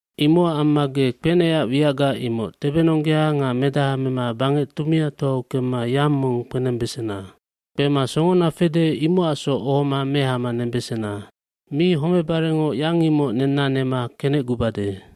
Imocac amma ge kpenecac wiacga imoc tebenonggea nga medaha mema bangec tumiatoau kemma yang mong kpenembesena. Kpema songona fede imocacsoc ohoma mehama nembesena. Mi homebarengoc yang imoc nenna nema kenecgubade.”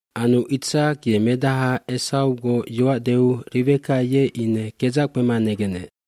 Anu Itsak ye medaha Esawgoc yoac deu Riweka ye ine kedzac kpema negenec.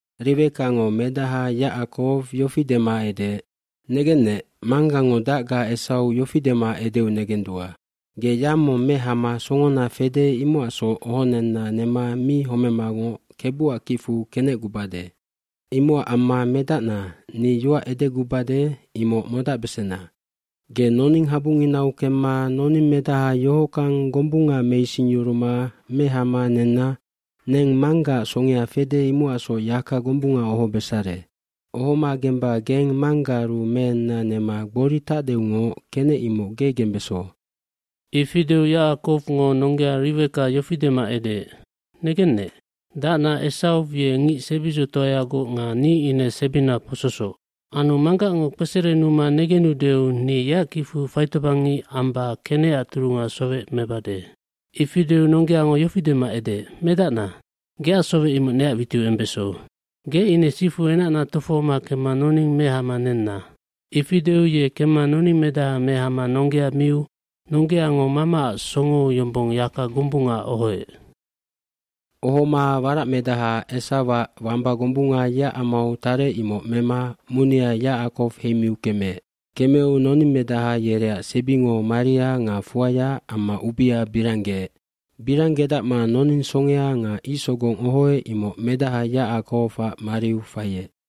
Riwekango medaha Yacakow yofi dema edeec, “Negennec, manggango dacga Esaw yofi dema edeu negendua. ‘Ge yang mong mehama songona fede imocacsoc ohonenna nema mi homemangoc Kebuac kicfu kenecgubade.’ Imocac amma medacna, ni yoac edegubade imoc modacbesena. Ge noning habunginau kemma noningmedaha yohockang gombunga meisingyuruma mehama nenna neng manggaac songea fede imocacsoc yaka gombunga ohobesare. Ohoma gemba geng manggaaru meenna nema gbori tacdeungoc kenec imoc ge gembeso.” aIfi deu Yacakowngo nonggea Riweka yofi dema edeec, “Negennec, dacna Esaw ye ngic sebidzotoayagoc nga ni ine sebina pososoc. Anu manggacngo kpeserenuma negenudeu ni yeac kicfu faitobangngic amba kenecac turunga sowec mebade.” Ifi deu nonggeango yofi dema edeec, “Medacna, geac sowec imoc neac witiu embeso. Ge ine sifu enacna tofohoma kemma noning mehama nenna.” Ifi deu ye kemma noningmedaha mehama nonggea miu nonggeango mamaac songou yombong yaka gombunga ohoec. Ohoma waracmedaha Esawac wamba gombunga yeac amau tarec imoc mema munia Yacakow heimiu kemeec. Kemeu noningmedaha yereac sebingo maria nga fuaya amma ubia biranggeec. Biranggedacma noning songea nga icsogong ohoec imoc medaha Yacakowac mariu faiec.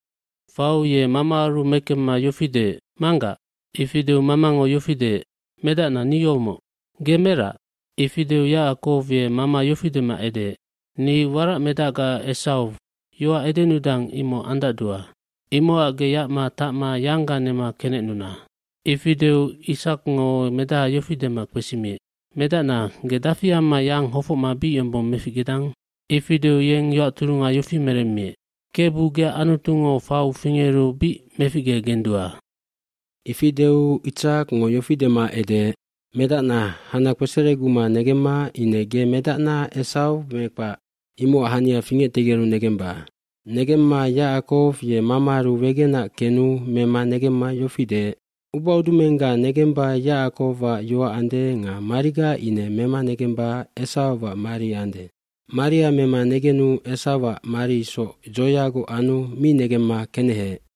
Fau ye mamaaru mekemma yofi deec, “Manggac.” Ifi deu mamango yofi deec, “Medacna ni yomoc.” “Ge merac?” Ifi deu Yacakow ye mama yofi dema edeec, “Ni waracmedacga Esaw, yoac edenudang imoc andacdua. Imocac ge yacma tacma yangga nema kenecnuna.” Ifi deu Itsakngo medaha yofi dema kpesimiec, “Medacna, ge dafi amma yang hofocma bic yombong meficgedang?” Ifi deu yeng yoac turunga yofi meremmiec, “Kebu, geac Anutungo fau fingeru bic meficgegendua.” Ifi deu Itsakngo yofi dema edeec, “Medacna, hana kpesereguma negemma ine ge medacna Esaw me kpac, imocac hania fingectegeru negemba.” Negemma Yacakow ye mamaaru wegenac kenu mema negemma yofi deec, “Ubaudumengga negemba Yacakowac yoac ande nga mariga ine mema negemba Esawac mari ande.” bMaria mema negenu Esawac mari isoc dzoyagoc anu mi negemma keneheec.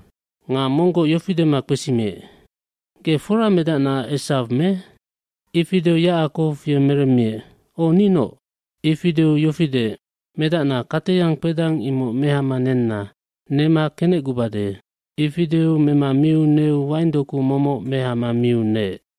Nga monggoc yofi dema kpesimiec, “Ge fora medacna Esaw me?” Ifi deu Yacakow ye meremmiec, “O, ninoc.” Ifi deu yofi deec, “Medacna kateyang kpedang imoc mehama nenna. Nema kenecgubade.” Ifi deu mema miu neu waingdoku momoc mehama miu neec.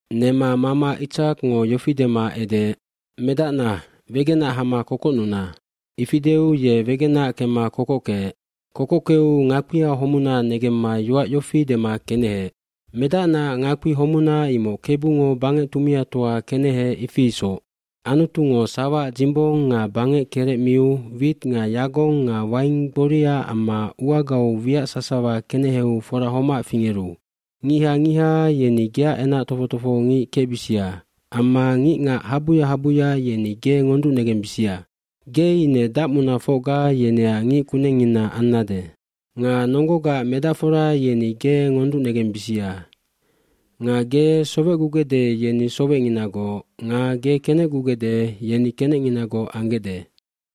Nema mama Itsakngo yofi dema edeec, “Medacna, wegenac hama kokocnuna.” cIfi deu ye wegenac kemma kokockeec. Kokockeu ngakpia homuna negemma yoac yofi dema keneheec, “Medacnaac ngakpi homuna imoc Kebungo bangec tumiatoa keneheec ifi isoc. Anutungo sawaac dzimbong nga bangec kerec miu wit nga yagong nga waing gboria amma uagau wiac sasawa keneheu fora homac fingeru. dNgiha ngiha yeni geac enac tofoc tofohongic kecbisia amma ngicngac habuya habuya yeni ge ngonducnegembisia. Ge ine dacmunafocga yeneac ngic kunengngina ambesannec. Nga nonggogaac medacfora yeni ge ngonducnegembisia. Nga ge sowecgugecde yeni sowecnginagoc nga ge kenecgugecde yeni kenecnginagoc anggecde.”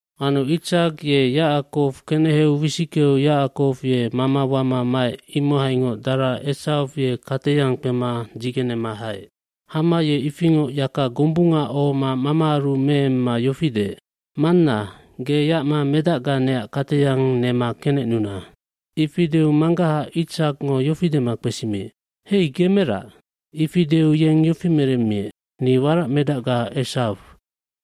Anu Itsak ye Yacakow keneheu wisickeu Yacakow ye mama wama maec imohaingoc dara Esaw ye kateyang kpema dzigenema haec. Hama ye ifingoc yaka gombunga ohoma mamaaru meemma yofi deec, “Manna, ge yacma medacga neac kateyang nema kenecnuna.” eIfi deu manggaha Itsakngo yofi dema kpesimiec, “Hei, ge merac?” Ifi deu yeng yofi meremmiec, “Ni waracmedacga Esaw.”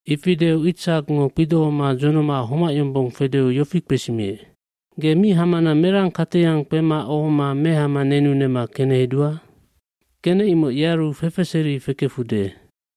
Ifi deu Itsakngo kpidohoma dzonoma homac yombong fedeu yofi kpesimiec, “Ge mi hamana merang kateyang kpema ohoma mehama nenu nema kenehedua? Kenec imoc yearu fefeseri fekefude.”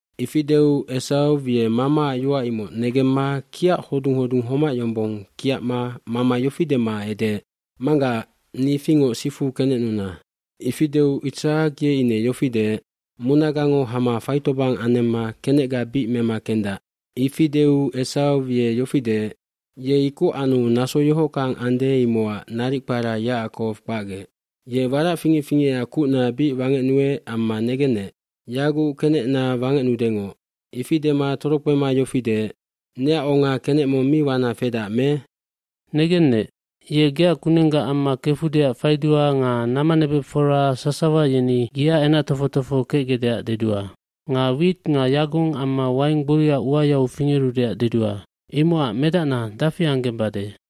fIfi deu Esaw ye mamaac yoac imoc negemma kiac hodung hodung homac yombong kiacma mama yofi dema edeec, “Manggac, ni ifingoc sifu kenecnuna.” Ifi deu Itsak ye ine yofi deec, “Munagango hama faitobang anemma kenecga bic mema kendac.” hIfi deu Esaw ye yofi deec, “Ye ikoc anu naso yohockang ande imocac naric kpara Yacakowg kpacgec. Ye warac fingec fingecac kucna bic wangecnuec amma negennec, yaguc kenecna wangecnudengoc.” Ifi dema torokpema yofi deec, “Neac onga kenec mong mi wana fedac me?” Ifi deu yofi meremmiec, “Negennec, ye geac kunengga amma kefudeac faidua nga namanebecfora sasawa yeni yeac enac tofoc tofoho kecgecdeac dedua. Nga wit nga yagong amma waing gboria uayau fingerudeac dedua. Imocac medacna dafi anggembade?”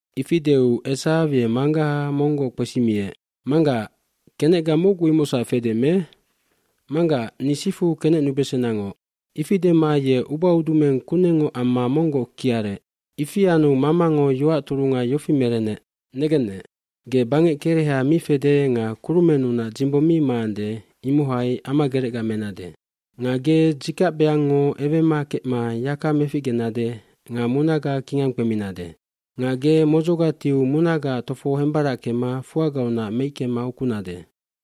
iIfi deu Esaw ye manggaha monggoc kpesimiec, “Manggac, kenecga mocgu imocsac fedac me? Manggac, ni sifu kenecnubesenangoc.” Ifi dema ye ubaudumeng kunengngoc amma monggoc kiarec. jIfi anu mamango yoac turunga yofi merenec, “Negennec, ge bangec kereha mi fede nga kurumennunac dzimbong mi maande imohai amagerecga menade. Nga ge dzikacbeangngo ewema kecma yaka meficgenade nga munaga kingang kpeminade. Nga ge modzoga tiu munagaac tofo hembarackema fuagaunac meickema ukunade.”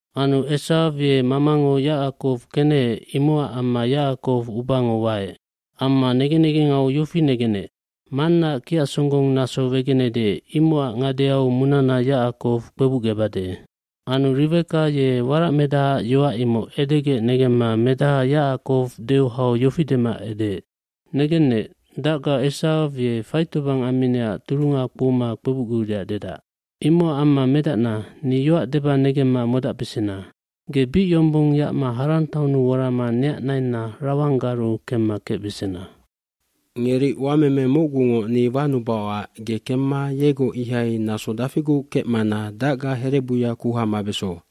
kAnu Esaw ye mamango Yacakow keneheec imocac amma Yacakow ubango waec. Amma negen negengau yofi negenec, “Mannaac kiac songgong naso wegenede imocac ngadeau munana Yacakow kpebucgebade.” lAnu Riweka ye waracmedahaac yoac imoc edegec negemma medaha Yacakow deu hau yofi dema edeec, “Negennec, dacga Esaw ye faitobang amminecac turunga kpouma kpebucguudeac dedac. mImocac amma medacna, ni yoac deba negemma modabesena. Ge bic yombong yacma Haran taonnu worama neac nainna Lawanggaru kemma kecbesena. Ngeri uameme mocgungoc ni wanubaocac ge kemma yegoc ihai naso dafiguc kecmana dacga herebuya kuha mabeso.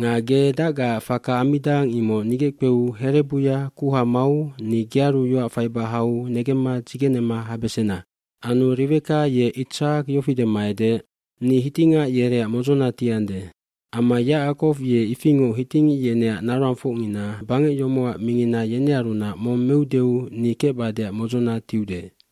Nga ge dacgaac faka ammidang imoc nigeckpeu herebuya kuha mau ni gearu yoac faiba hau negemma dzigenema habesena.” nAnu Riweka ye Itsak yofi dema edeec, “Ni hitingac yereac modzona tiande. Amma Yacakow ye ifingoc hitingic yeneac naroangfocngina, bangec yomocac mingina yenearunac mong meudeu ni kecbadeac modzona tiude.”